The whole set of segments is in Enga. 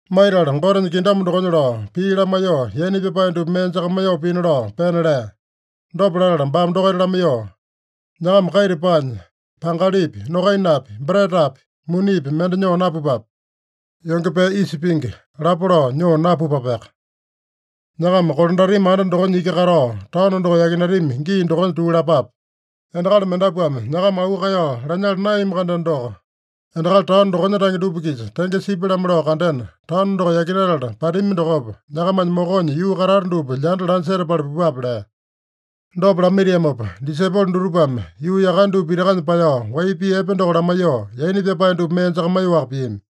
Maitala Gotenya kingdom dokonya lao pii lamaiyoo, yaina pyapae dupa mee jakamaiyoo pina lao pena lea. Dopa latala baame dokaita lamaiyoo, “Nyakama kaita paanya, pangalipi, nokainapi, bretapi, munipi mende nyoo napupape. Yonge pee isa pingi lapo lao nyoo napupapeaka. Nyakama kolandatami anda dokonya iki katao, taono doko yakinatami gii dokonya tuu lapape. Endakali mendapuame nyakama auu kaeyao lanyala naeyami-kandeno doko, endakali taono dokonya tange dupa-kisa tenge sipya-lamo lao kandena, taono doko yakinatala patami dokopa, nyakamanya mokonya yuu katata dupa lyanda lanya setapala pupape” lea. Dopa lamaitiamopa disaipolo dutupame yuu yakane dupa pitakanya paeyao, wai pii epe doko lamaiyoo, yaina pyapae dupa mee jakamaiyoaka piami.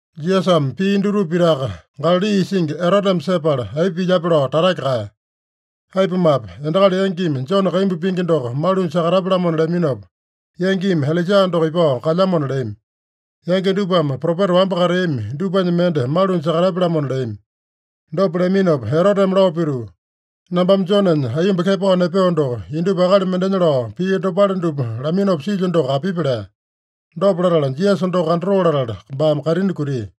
Jisasame pia dutupa pitaka Galali isingi Eroteme sepala, aipa pilyape lao tatake kaeya. Aipumape, endakali yangimi Jone kaimbu pingi doko malunya sakatapya-lamona leaminopa, yangimi Ilaija doko ipao kalyamona leami. Yangi dupame propeta wamba kateami dupanya mende malunya sakatapya-lamona leami. Dopa leaminopa Eroteme lao pituu, “Nambame Jonenya aiyomba kepao nepeo doko, indupa akali mendenya lao pii dopale dupa laminopa silyo doko apipi?” lea. Dopa latala, Jisasa doko kandatoo latala, baame kaitini kutia.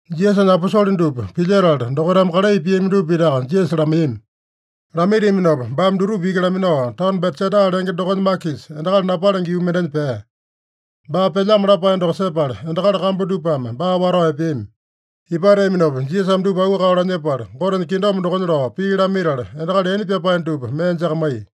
Jisasanya aposole dupa pilyetala, dokaitame kalai piami dupa pitaka Jisasa lamaiyami. Lamaitiaminopa baame dutupa iki laminao, taono Betsaida lenge dokonya makisa, endakali napalenge yuu mendenya pea. Baa pelyamo lapae doko sepala, endakali kambu dupame baa watao epeami. Ipateaminopa Jisasame dupa auu kaeyao lanyepala, Gotenya kingdom dokonya lao pii lamaitala, endakali yaina pyapae dupa mee jakamaiya.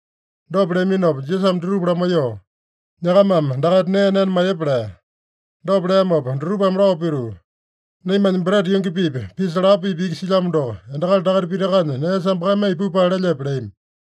Dopa leaminopa Jisasame dutupa lamaiyoo, “Nyakamame dakaita nee nena maiyepa” lea. Dopa leamopa dutupame lao pituu, “Naimanya breta yungi-pipa, pisa lapo-pipa iki silyamo doko, endakali dakaita pitakanya nee sambakamaiya pupale lelyepe?” leami.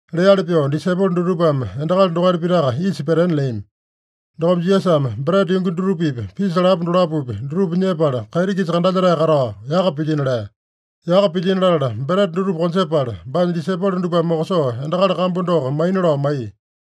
Leali pyoo, disaipolo dutupame endakali dokaita pitaka isa petena leami. Dokopa Jisasame breta yungi dutupapi, pisa lapo dolapopi, dutupa nyepala, kaiti-kisa kandalyetae katao yaka pilyino lea. Yaka pilyino latala, breta dutupa konjepala, baanya disaipolo dupame mokosoo endakali kambu doko maina lao maiya.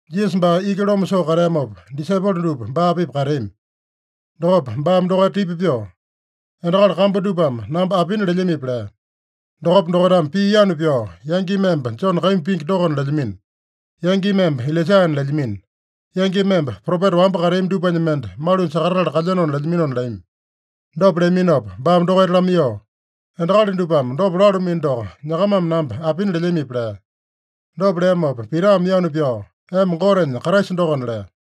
Jisasa baa iki loma soo kateamopa, disaipolo dupa baa-pipa kateami. Dokopa baame dokaita tipa pyoo, “Endakali kambu dupame namba apina lelyamipi?” lea. Dokopa dokaitame pii yanu pyao, “Yangimi emba Jone kaimbu pingi dokona lelyamino. Yangimi emba Ilaijana lelyamino. Yangimi emba propeta wamba kateami dupanya mende malunya sakatatala kalyeno lelyaminona” leami. Dopa leaminopa baame dokaita lamaiyoo, “Endakali dupame dopa lalumino doko, nyakamame namba apina lelyamipi?” lea. Dopa leamopa Pitame yanu pyao, “Emba Gotenya Kraisa dokona” lea.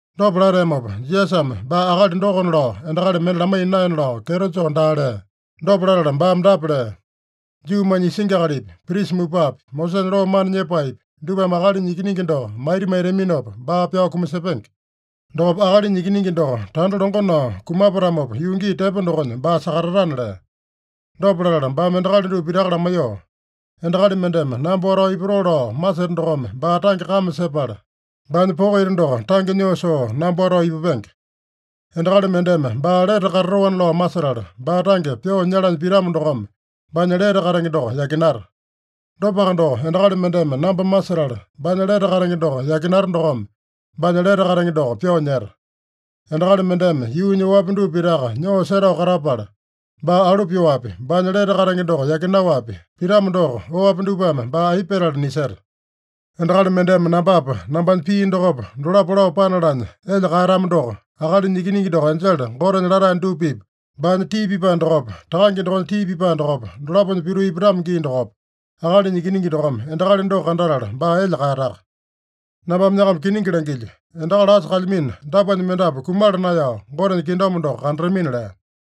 Dopa lateamopa, Jisasame baa akali dokona lao endakali mende lamaiya naena lao kyeto joo daa lea. Dopa latala baame dapa lea: “Juumanya isingi akalipi, prisa mupapi, Mosesanya loo mana nyepaepi, dupame Akalinya Ikiningi doko maita maitaminopa baa pyao kumasepenge. Dokopa Akalinya Ikiningi doko tanda longo nao kumapatamopa, yuu gii tepo dokonya baa sakatatana” lea. Dopa latala baame endakali dupa pitaka lamaiyoo, “Endakali mendeme namba watao ipatoo lao maseta dokome baa tange kame sepala, baanya poko ita doko tange nyoo soo namba watao ipupenge. Endakali mendeme baa lete katatoana lao masetala, baa tange pyoo nyalanya pitamo dokome baanya lete katenge doko yakinata. Dopaka doko, endakali mendeme namba masetala, baanya lete katenge doko yakinata dokome baanya lete katenge doko pyoo nyeta. Endakali mendeme yuunya oapi dupa pitaka nyoo setao katapala, baa alu pyoapi, baanya lete katenge doko yakinaowapi pitamo doko, oapi dupame baa aipa petala niseta? Endakali mendeme nambapa, nambanya pii dokopa, dolapo lao panalanya elya kaeyatamo doko, Akalinya Ikiningi doko enjele Gotenya latae dupa-pipa, baanya tii pipae dokopa, Takange dokonya tii pipae dokopa, dolaponya pituu ipatamo gii dokopa, Akalinya Ikiningi dokome endakali doko kandatala baa elya kaeyataka. Nambame nyakama kiningi langilyo: Endakali asa kalyamino dapuanya mendapu kumala naeyao, Gotenya kingdom doko kandatamina” lea.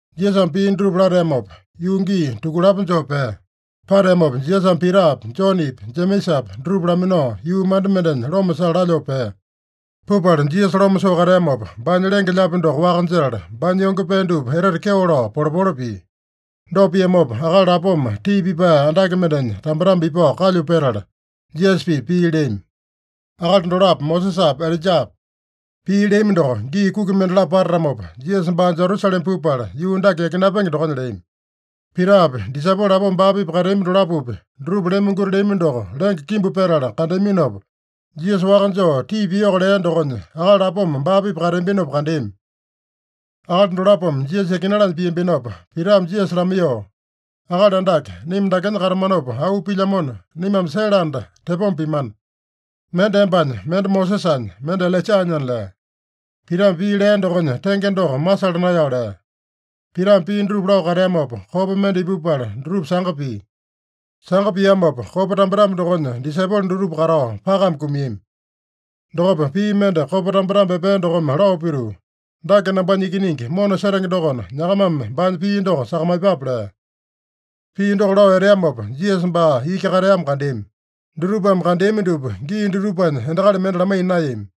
Jisasame pii dutupa lateamopa, yuu gii tukulapo joo pea. Pateamopa Jisasame Pitapi, Jonepi, Jemesapi dutupa laminao, yuu manda mendenya loma sala lalyoo pea. Pupala Jisasa loma soo kateamopa, baanya lenge-lyaapi doko waka jetala, baanya yonge pee dupa etete kyeo lao polepole pia. Dopa piamopa, akali lapoma tii pipae andake mendenya tambetambe ipao kalyu petala, Jisasa-pipa pii leami. Akali dolapo Mosesapa, Ilaijapa. Pii leami doko, gii kuki mendalapo patatamopa, Jisasa baa Jerusalema pupala yuu dake yakinapenge dokonya leami. Pitapi, disaipolo lapoma baa-pipa kateambi dolapopi, dutupa lemonguti leami doko, lenge kimbu petala kandeaminopa, Jisasa waka joo tii piyoko lea dokonya, akali lapoma baa-pipa kateambinopa kandeami. Akali dolapome Jisasa yakinalanya piambinopa, Pitame Jisasa lamaiyoo, “Akali Andake, naima dakenya katamanopa auu pilyamona, naimame sele anda tepoma pimana. Mende embanya, mende Mosesanya, mende Ilaijanyana” lea. (Pitame pii lea dokonya tenge doko masala naeyao lea.) Pitame pii dutupa lao kateamopa, kopa mende ipupala dutupa sanga pia. Sanga piamopa, kopa tambetambe dokonya disaipolo dutupa katao pakame kumiami. Dokopa pii mende kopa tambetambe epea dokome lao pituu, “Dake nambanya Ikiningi mona setenge dokona, nyakamame baanya pii doko sakamaiyepape” lea. Pii doko lao eteamopa, Jisasa baa iki kateamo kandeami. Dutupame kandeami dupa gii dutupanya endakali mende lamaiya naeyami.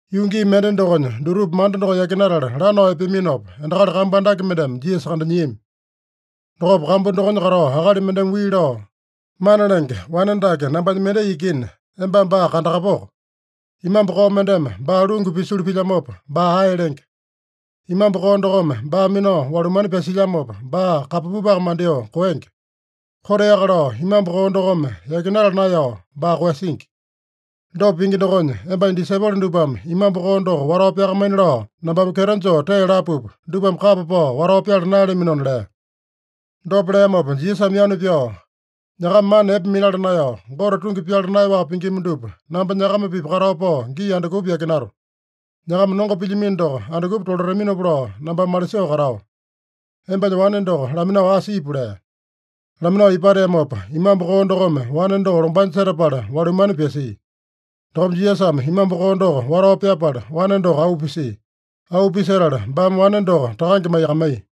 Yuu gii mende dokonya dutupa manda doko yakinatala lanao epeaminopa, endakali kambu andake mendeme Jisasa kandanyiami. Dokopa kambu dokonya katao akali mendeme wii lao, “Mana Lenge, wane dake nambanya mendai ikina, embame baa kandakapoko. Imambu koo mendeme baa lungu pisulu pilyamopa, baa ae lenge. Imambu koo dokome baa minao walumane pyasilyamopa, baa kambapupaka mandyoo koenge. Koteaka lao imambu koo dokome yakinala naeyao baa koeyasingi. Dopa pingi dokonya, embanya disaipolo dupame imambu koo doko watao pyakamaina lao nambame kyeto joo tee lapupa, dupame kapa pao watao pyala naeyalaminona” lea. Dopa leamopa Jisasame yanu pyao, “Nyakama mana epe minala naeyao, Gote tungi pyala naeyaowaka pingima dupa, namba nyakama-pipa katao pao gii andukupa yakinato? Nyakama nongo pilyamino doko andukupa tolataminopa lao nambame malisoo katao? Embanya wane doko laminao asa ipu” lea. Laminao ipateamopa, imambu koo dokome wane doko lombanya setapala walumane pyasia. Dokopa Jisasame imambu koo doko watao pyapala, wane doko auu pisia. Auu pisetala baame wane doko takange maiyakamaiya.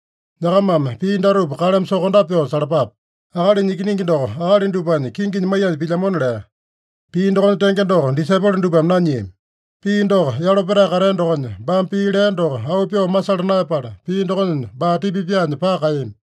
“Nyakamame pii datupa kaleme sokondape pyoo salapape: Akalinya Ikiningi doko akali dupanya kinginya maiyanya pilyamona” lea. Pii dokonya tenge doko disaipolo dupame nanyiami. Pii doko yalo petae katea dokonya, baame pii lea doko auu pyoo masala naeyapala, pii dokonya baa tipa pyaanya paka kaeyami.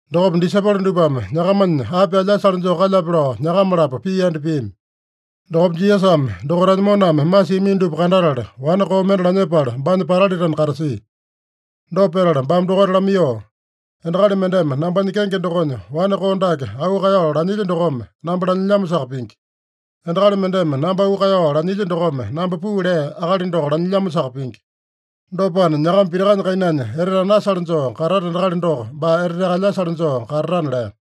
Dokopa disaipolo dupame nyakamanya api alyasale joo kalyape lao nyakama-lapo pii yanda piami. Dokopa Jisasame dokaitanya moname masiamino dupa kandatala, wane koo mende lanyepala, baanya patalitena katasia. Dopa petala baame dokaita lamaiyoo, “Endakali mendeme nambanya kenge dokonya wane koo dake auu kaeyao lanyilya dokome, namba lanyilyamosaka pingi. Endakali mendeme namba auu kaeyao lanyilya dokome, namba puu lea Akali doko lanyilyamosaka pingi. Dopana, nyakama pitakanya kainanya etete anasale joo katata endakali doko, baa eteteaka alyasale joo katatana” lea.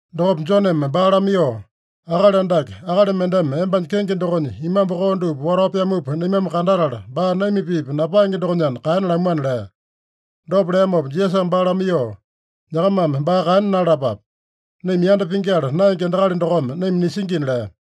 Dokopa Joneme baa lamaiyoo, “Akali Andake, akali mendeme embanya kenge dokonya imambu koo dupa watao pyamupa naimame kandatala, baa naima-pipa napaenge dokonyana kaena lamuana” lea. Dopa leamopa Jisasame baa lamaiyoo, “Nyakamame baa kaena nalalapape. Naima yanda pingyala naenge endakali dokome naima nisingina” lea.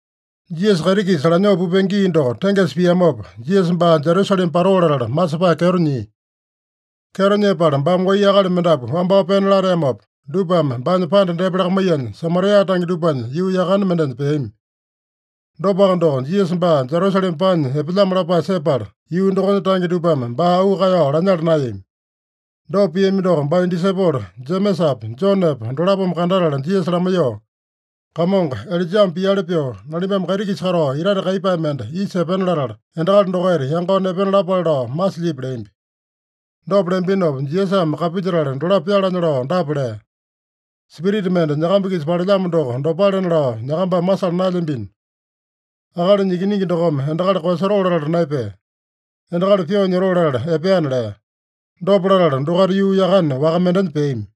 Jisasa kaiti-kisa lanyoo pupenge gii doko tengesa piamopa, Jisasa baa Jerusalema patoo latala masepae kyeto nyia. Kyeto nyepala baame wai akali mendapu wambao pena lateamopa, dupame baanya panda depa lakamaiyanya, Samaria tange dupanya yuu yakane mendenya peami. Dopaka doko, Jisasa baa Jerusalema paanya epelyamo lapae sepala, yuu dokonya tange dupame baa auu kaeyao lanyala naeyami. Dopa piami doko baanya disaipolo Jemesapa, Jonepa dolapome kandatala Jisasa lamaiyoo, “Kamongo, Ilaijame piali pyoo, nalimbame kaiti-kisa katao itate kaiyepae mende isa epena latala, endakali dokaita yangao nepena lapale lao masilyipi?” leambi. Dopa leambinopa, Jisasame kapilyetala dolapo pyalanya lao dapa lea: “Spirita mende nyakamba-kisa palelyamo doko dopalena lao nyakambame masala naelyambino. Akalinya Ikiningi dokome endakali koeyasotoo latala naepea. Endakali pyoo nyotoo latala epeana” lea. Dopa latala, dokaita yuu yakane waka mendenya peami.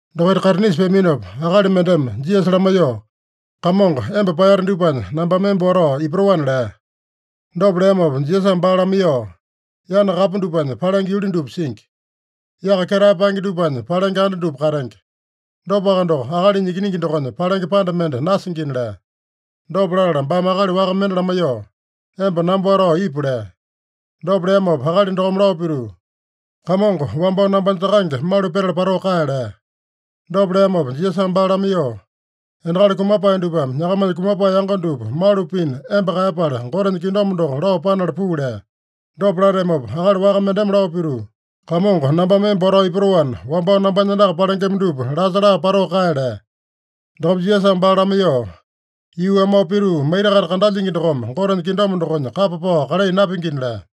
Dokaita kaitinisa peaminopa, akali mendeme Jisasa lamaiyoo, “Kamongo, emba paeyate dupanya nambame emba watao ipatoana” lea. Dopa leamopa Jisasame baa lamaiyoo, “Yana kapu dupanya palenge yuli dupa singi. Yaka ketae paenge dupanya palenge anda dupa katenge. Dopaka doko, Akalinya Ikiningi dokonya palenge panda mende nasingina” lea. Dopa latala baame akali waka mende lamaiyoo, “Emba namba watao ipu” lea. Dopa leamopa akali dokome lao pituu, “Kamongo, wambao nambanya takange malu petala patoo kae” lea. Dopa leamopa Jisasame baa lamaiyoo, “Endakali kumapae dupame nyakamanya kumapae yango dupa malu pina emba kaeyapala, Gotenya kingdom doko lao panala puu” lea. Dopa lateamopa akali waka mendeme lao pituu, “Kamongo, nambame emba watao ipatoana, wambao nambanya andaka palengema dupa lasa laa patoo kae” lea. Dokopa Jisasame baa lamaiyoo, “Yuu amao pituu maita-kaita kandalyingi dokome Gotenya kingdom dokonya kapa pao kalai napingina” lea.